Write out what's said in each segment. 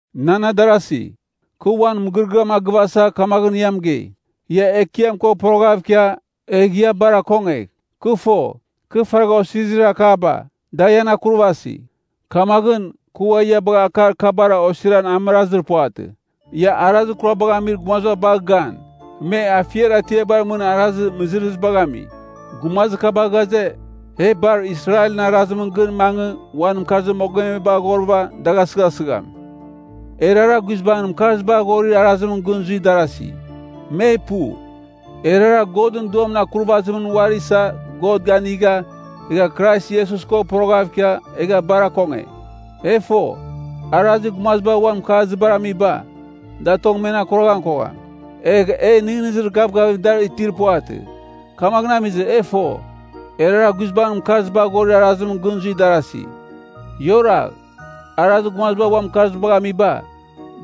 Nan adarasi, kɨ uan mɨgɨrɨgɨam a gɨvasa kamaghɨn ia mɨgei, ia Ekiam ko poroghav ikia, egh ia bar akongegh. Kɨ fo, kɨ faragh osirizir akaba, da ian akurvasi. Kamaghɨn, kɨ ua ia bagha akar kabara osiran amɨrazir puvatɨ. Ia arazir kurabagh amir gumaziba bagh gan, me afiar atiabar mɨn arazir mɨzɨrɨzibagh ami. Gumazir kaba ghaze, e bar Israelɨn arazimɨn gɨn mangɨ uan mɨkarziba aghorɨva dagh asɨghasɨgham. Erara guizbangɨn mɨkarzibar aghorir arazimɨn gɨn zuir darasi. Me pu. Erara Godɨn Duamɨn akurvazimɨn uari isa God ganigha egha Krais Iesus ko poroghav ikia egha bar akonge. E fo, arazir gumaziba uan mɨkarzibar amiba, da tong men akuragham kogham, egh e nɨghnɨzir gavgavim dar itir puvatɨ. Kamaghɨn amizɨ, e fo, erara guizbangɨn mɨkarzibar aghorir arazimɨn gɨn zuir darasi. Ia oragh. Arazir gumaziba uan mɨkarzibar amiba,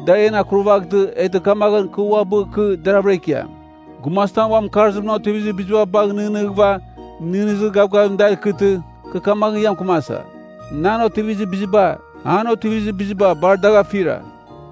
da en akurvaghtɨ, eghtɨ kamaghɨn kɨ uabɨ kɨ deravɨra ikiam. Gumazitam uan mɨkarzimɨn otivizir biziba bagh nɨghnɨghɨva nɨghnɨzir gavgavim dar ikɨtɨ, kɨ kamaghɨn ia mɨkɨmasa, nan otivizir biziba, an otivizir biziba bar dagh afira.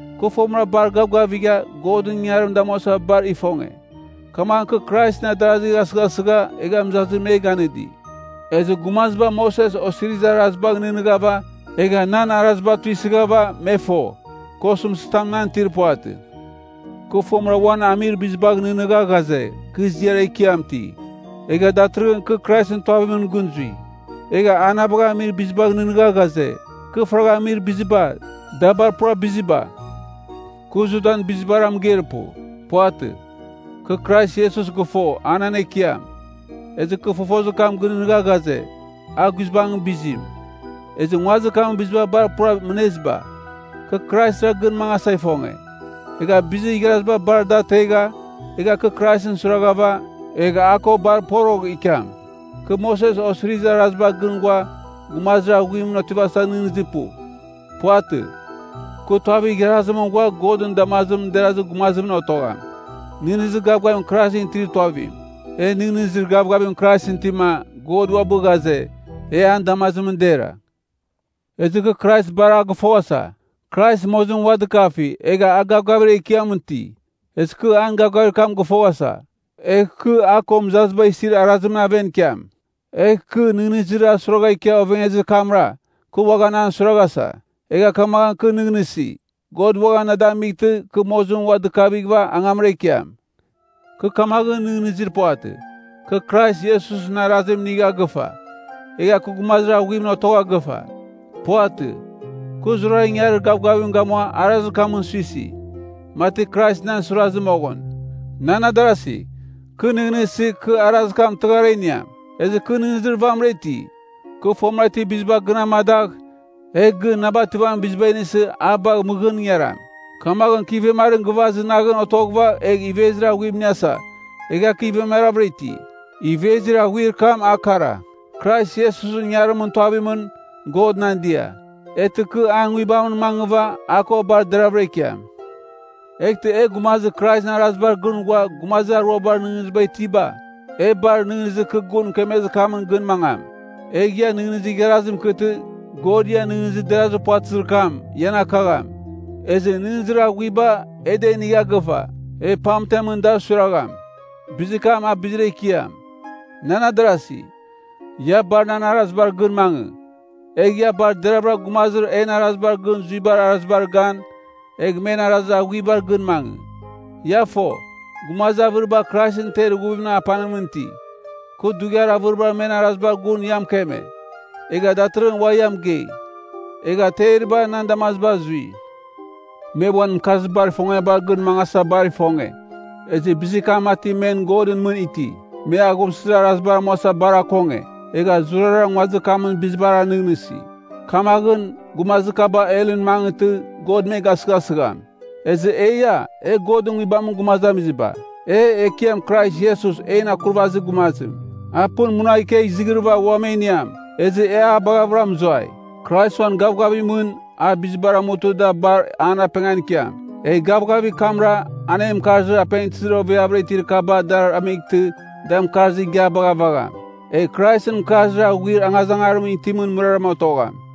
Kɨ fomɨra bar gavgavigha Godɨn ingangarim damuasa bar ifonge, kamaghɨn kɨ Kraisɨn adarazigh asɨghasɨgha egha mɨzazim me ganɨdi. Ezɨ gumaziba Moses Osirizir Arazibagh nɨghnɨghava, egha nan arazibar tuisɨghava, me fo, kɨ osɨmtɨzitam nan itir puvatɨ. Kɨ fomɨra uan amir bizibagh nɨghnɨgha ghaze, kɨ ziar ekiam iti. Egha datɨrɨghɨn kɨ Kraisɨn tuavimɨn gɨn zui. Egha a na bagha amir bizibagh nɨghnɨgha ghaze, kɨ faragha amizir biziba, da bar pura biziba. Kɨ Judan bizibara mɨgeir pu. Puvatɨ. Kɨ Krais Iesus gɨfo a nan Ekiam, ezɨ kɨ fofozir kam gɨnɨghnɨgha ghaze, a guizbangɨn bizim, ezɨ nguazir kamɨn biziba bar pura mɨneziba. Kɨ Kraisra gɨn mangasa ifonge. Egha bizir igharaziba bar da ategha, egh kɨ Kraisɨn suiraghɨva, egh a ko bar porogh ikiam. Kɨ Moses Osirizir Arazibar gɨn ghua, gumazir aghuimɨn otivasa nɨghnɨzir pu. Puvatɨ. Kɨ tuavir igharazimɨn ghua Godɨn damazimɨn derazir gumazimɨn otogham, nɨghnɨzir gavgavim Kraisɨn itir tuavim. E nɨghnɨzir gavgavim Kraisɨn itima, God uabɨ ghaze, e an damazimɨn dera. Ezɨ kɨ Krais bar a gɨfoghasa. Krais mozimɨn ua dɨkafi, egha a gavgavir ekiam iti, ezɨ kɨ an gavgavir kam gɨfoghasa. Egh kɨ a ko mɨzaziba isir arazimɨn aven ikiam. Egh kɨ, nɨghnɨzir a suiragha ikia ovengezir kamra, kɨ uaghan an suiraghasa. Egha kamaghɨn kɨ nɨghnɨsi, God uaghan na damightɨ kɨ mozimɨn ua dɨkavighɨva angamra ikiam. Kɨ kamaghɨn nɨghnɨzir puvatɨ, kɨ Krais Iesusɨn arazim inigha gɨfa, egha kɨ gumazir aghuimɨn otogha gɨfa. Puvatɨ. Kɨ zurara ingangarir gavgavim gamua arazir kamɨn suisi, mati Krais nan suirazɨ moghɨn. Nan adarasi, kɨ nɨghnɨsi, kɨ arazir kam tɨghar a iniam. Ezɨ kɨ nɨghnɨzir vamɨra iti, kɨ fomɨra itir biziba gɨn amadagh, egh gɨn na bativamin bizim inisɨ a bagh mɨghɨn ingaram. Kamaghɨn kɨ ivemarim gɨvaz naghɨn otoghɨva egh ivezir aghuim iniasa, egha kɨ ivemaravɨra iti. Ivezir aghuir kam a kara. Krais Iesusɨn ingangarimɨn tuavimɨn, God nan dia. Eghtɨ kɨ an Nguibamɨn mangɨva a ko bar deravɨra ikiam. Eghtɨ e gumazir Kraisɨn arazibar gɨn ghua gumazir aruabar nɨghnɨziba itiba, e bar nɨghnɨzir kɨ gun mɨkemezir kamɨn gɨn mangam. Egh ia nɨghnɨzir igharazim ikɨtɨ, God ian nɨghnɨzir derazir puvatɨzir kam, ian akagham. Ezɨ nɨghnɨzir aghuiba e da inigha gɨfa, e pamtemɨn dar suiragham. Bizir kam a bizir ekiam. Nan adarasi, ia bar nan arazibar gɨn mangɨ. Egh ia bar deravɨra gumazir en arazibar gɨn zuibar arazibar gan, egh men arazir aghuibar gɨn mangɨ. Ia fo, gumazir avɨriba Kraisɨn ter ighuvimɨn apanimɨn iti. Kɨ dughiar avɨriba men arazibar gun ia mɨkeme, egha datɨrɨghɨn ua ia mɨgei, egha teriba nan damaziba azui. Me uan mɨkarzibar ifongiabar gɨn mangasa bar ifonge, ezɨ bizir kam mati men godɨn mɨn iti. Me aghumsɨzir arazibar amuasa bar akonge, egha zurara nguazir kamɨn bizibara nɨghnɨsi. Kamaghɨn, gumazir kaba helɨn mangɨtɨ God me gasɨgasɨgham. Ezɨ eia, e Godɨn Nguibamɨn gumazamiziba. E, Ekiam Krais Iesus en Akurvazir Gumazim, a pɨn munagh ikegh izighrɨva uam e iniam, ezɨ e a baghavɨra mɨzuai. Krais uan gavgavimɨn a bizibar amutɨ da bar an apengan ikiam. Egh gavgavir kamra an en mɨkarzir apengtɨzir oveavɨra itir kaba dar amightɨ, da mɨkarzir igiabagh avagham. Egh Kraisɨn mɨkarzir aghuir angazangarimɨn itimɨn mɨraram otogham.